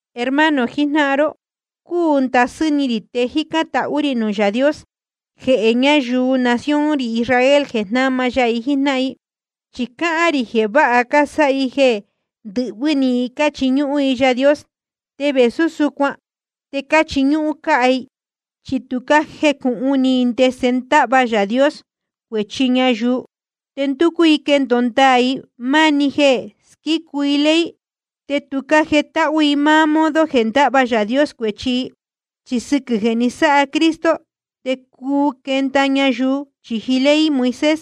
Hermano jijnáhan ró, cúu ndasɨ́ ni rī te jícán tahú rī nuū Yaā Dios jehē ñayuu nación rī Israel, jeē na jnáma ya i jíjnáhan i. Chi cáhán rī jeē vāha cásáha i jeē ndɨhvɨ́ ni i cáchiñúhún i Yaā Dios. Te vēsú súcuan te cáchiñúhún cáhá i. Chi tu cájecūhun ni i ndese ndáhva Yaā Dios cuēchi ñayuu, te ndúcú i quendōo ndaā i máá‑ni jeē squícu i ley. Te tu cájetáhú i máá modo jeē ndáhva Yaā Dios cuēchi i. Chi sɨquɨ̄ jeē ni sáha Cristo te cuu quenda ñayuu chīji ley Moisés.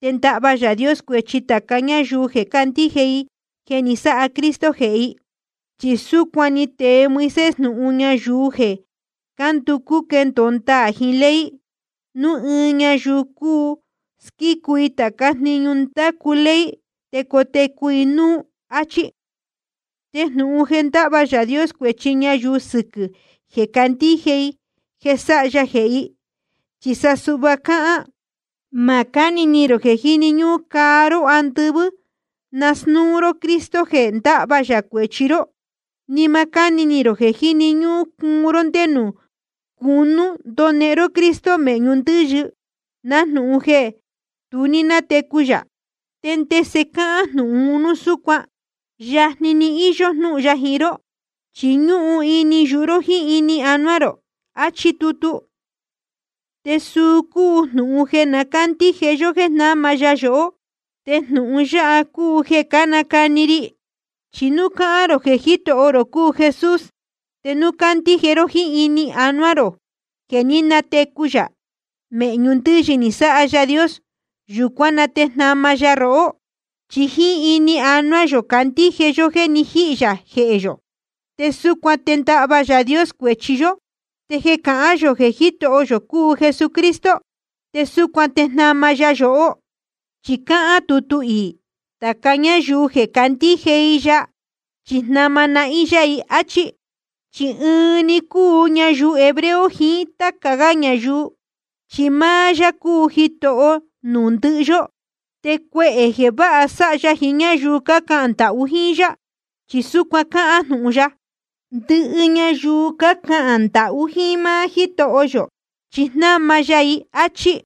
Te ndáhva Yaā Dios cuēchi tāca ñáyuu jeē candíje i jeē ni sáha Cristo jehē i. Chi súcuan ni tee Moisés jnūhun ñayuu jeē cánducú quendōo ndaā jiín ley: Núu ɨɨn ñayuu cuu squícu i tācá jniñu ndácu ley, te cotecu i núú, áchí. Te jnūhun jeē ndáhva Yaā Dios cuēchi ñayuu sɨquɨ̄ jeē candíje i jeē sáha ya jehē i, chi sa suhva cáhán: Ma cáni ni rō jeē jíni ñúhún caa ró andɨvɨ́ nasnúu ró Cristo jeē ndahva yā cuēchi ró. Ni ma cáni ni rō jeē jíni ñúhún cuun ró ndé nuū cūnú ndonehen ró Cristo mēhñu ndɨ́yɨ, nájnūhun jeē tu ní nátecu yā. ¿Te ndese cáhán jnūhun un núu súcuan? Yajni íyó jnúhun ya jiín ró, chi ñúhun ini yuhu ró jíín ini anuá rō, achí tutu. Te suu cúu jnūhun jeē na cándíje yó jéē jnáma ya yohó. Te jnūhun yáha cúu jeē cánacani ri. Chi núu cahān rō jeē Jítoho rō cúu Jesús, te núu candíje ró jíín ini jiín ánuá rō jeē ní natecu yā mēhñu ndɨ́yɨ ni sáha Yaā Dios, yūcuán na te jnama ya rohó. Chi jíín ini jiín ánuá yō cándíje yó jéē ni jíhī yā jehē yō, te súcuan te ndáhva Yaā Dios cuēchi yó. Te jeē cahán yō jeē Jítoho yō cúu Jesucristo, te súcuan te jnama ya yohó. Chi cáhán tutu iī: Tāca ñáyuu jeē candíje i ya, chi jnama nahín yá i, áchí. Chi ɨnuú‑ni cúu ñayuu hebreo jiín táca gá ñayuu, chi máá yá cúu Jitoho nuū ndɨhɨ yó, te cuehē jeē váha sáha ya jiín ñáyuu cácahān ndahú jíín yá. Chi súcuan cáhán jnūhun ya: Ndɨhɨ ñayuu cácahān ndahú jíín máá Jítoho yō, chi jnama ya i, áchí.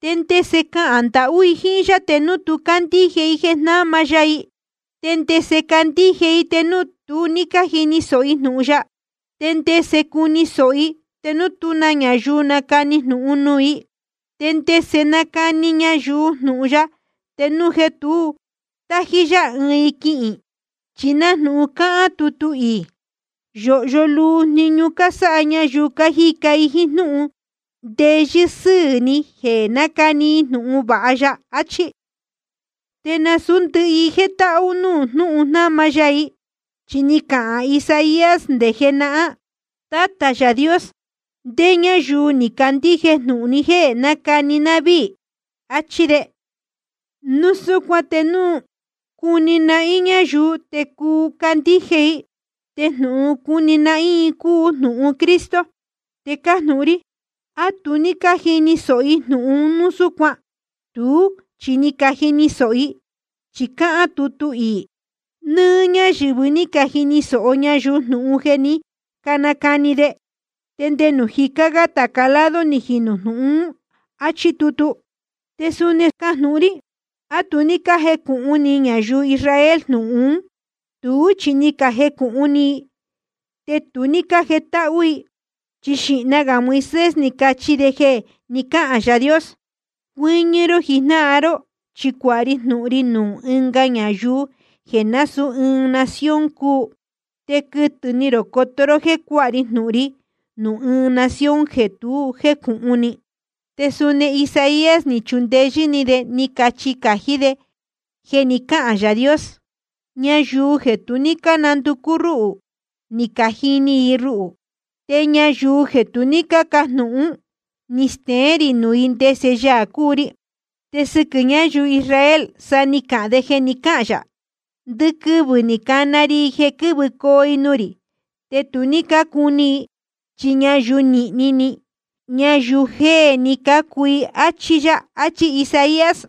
¿Te ndese cahān ndahú i jíín yá te núu tu ní cándíje i jeē jnama ya i? ¿Te ndese candíje i te núu tu ní jíni sōho i jnūhun ya? ¿Te ndese cuni sōho i te núu tú na ñayuu nacani jnūhun nuū i? ¿Te ndese nacani ñayuu jnūhun ya te núu jeē tu tájí yá i quihīn i? Chi nájnūhun cáhán tutu iī: Yōhyo luu jniñu cásáha ñayuu cájica jíín jnúhun ndeyɨ́ sɨ́ɨ̄ ni jeē cánacani i jnūhun vāha ya, achí. Te nasūú ndɨhɨ i jétáhú nuū jnúhun jnama ya i. Chi ni cahān Isaías nde jenahán: Tátā Yaā Dios, ¿ndé ñáyuu ni candíje jnūhun jeē cánacani ná víī? áchí de. Núu súcuan te núu cuni nahín ñayuu te cuu candíje i. Te jnūhun cuni nahín i cúu jnūhun Cristo. Te cájnūhun rí: ¿A tu ní cájini sōho i jnūhun un núu súcuan? Tuú chi ni cajini sōho i, chi cáhán tutu iī: Nɨ́ɨ́ ñáyɨ̄vɨ ní cajini sōho ñayuu jnūhun jeē ní canacani de. Te nde nuū jicá gá tāca lado ni jinū jnūhun ún. Achí tutu. Te suni cájnūhun rí: ¿A tu ní cájecūhun ni ñayuu Israel jnūhun ún? Tuú chi ni cajecūhun ni i, te tu ní cájetáhú i. Chi xīhna gā Moisés ni cachi de jeē ni cáhān Yaā Dios: Cucuɨ́ñɨ́ ró jijnáhan ró, chi cuāha ri jnūhun ri nuū ɨnga ñayuu jeē násūú ɨɨn nación cúu. Te quɨtɨ̄ ni rō coto ró jéē cuáha ri jnūhun ri nuū ɨɨn nación jeē tu jécūhun ni. Te suni Isaías ni chundeyɨ́ ni de ni cachi cājí de jeē ni cáhān Yaā Dios: Ñayuu jeē tu ní cánanducú rúhū, ni cajini i ruhū. Te nuū ñáyuu jeē tu ní cácajnūhún, ni steén rī nuū i ndese Yaā cúu ri. Te sɨquɨ̄ ñáyuu Israel sa ni cahān de jeē ni cáhān yā: Ndɨquɨvɨ̄ ni cana ri i jeē quɨ́vɨcoo i nuū rī, te tu ní cácuni i, chi ñayuu nīhni ni, ñayuu jéē ni cácuu i. Achí yá, achí Isaías.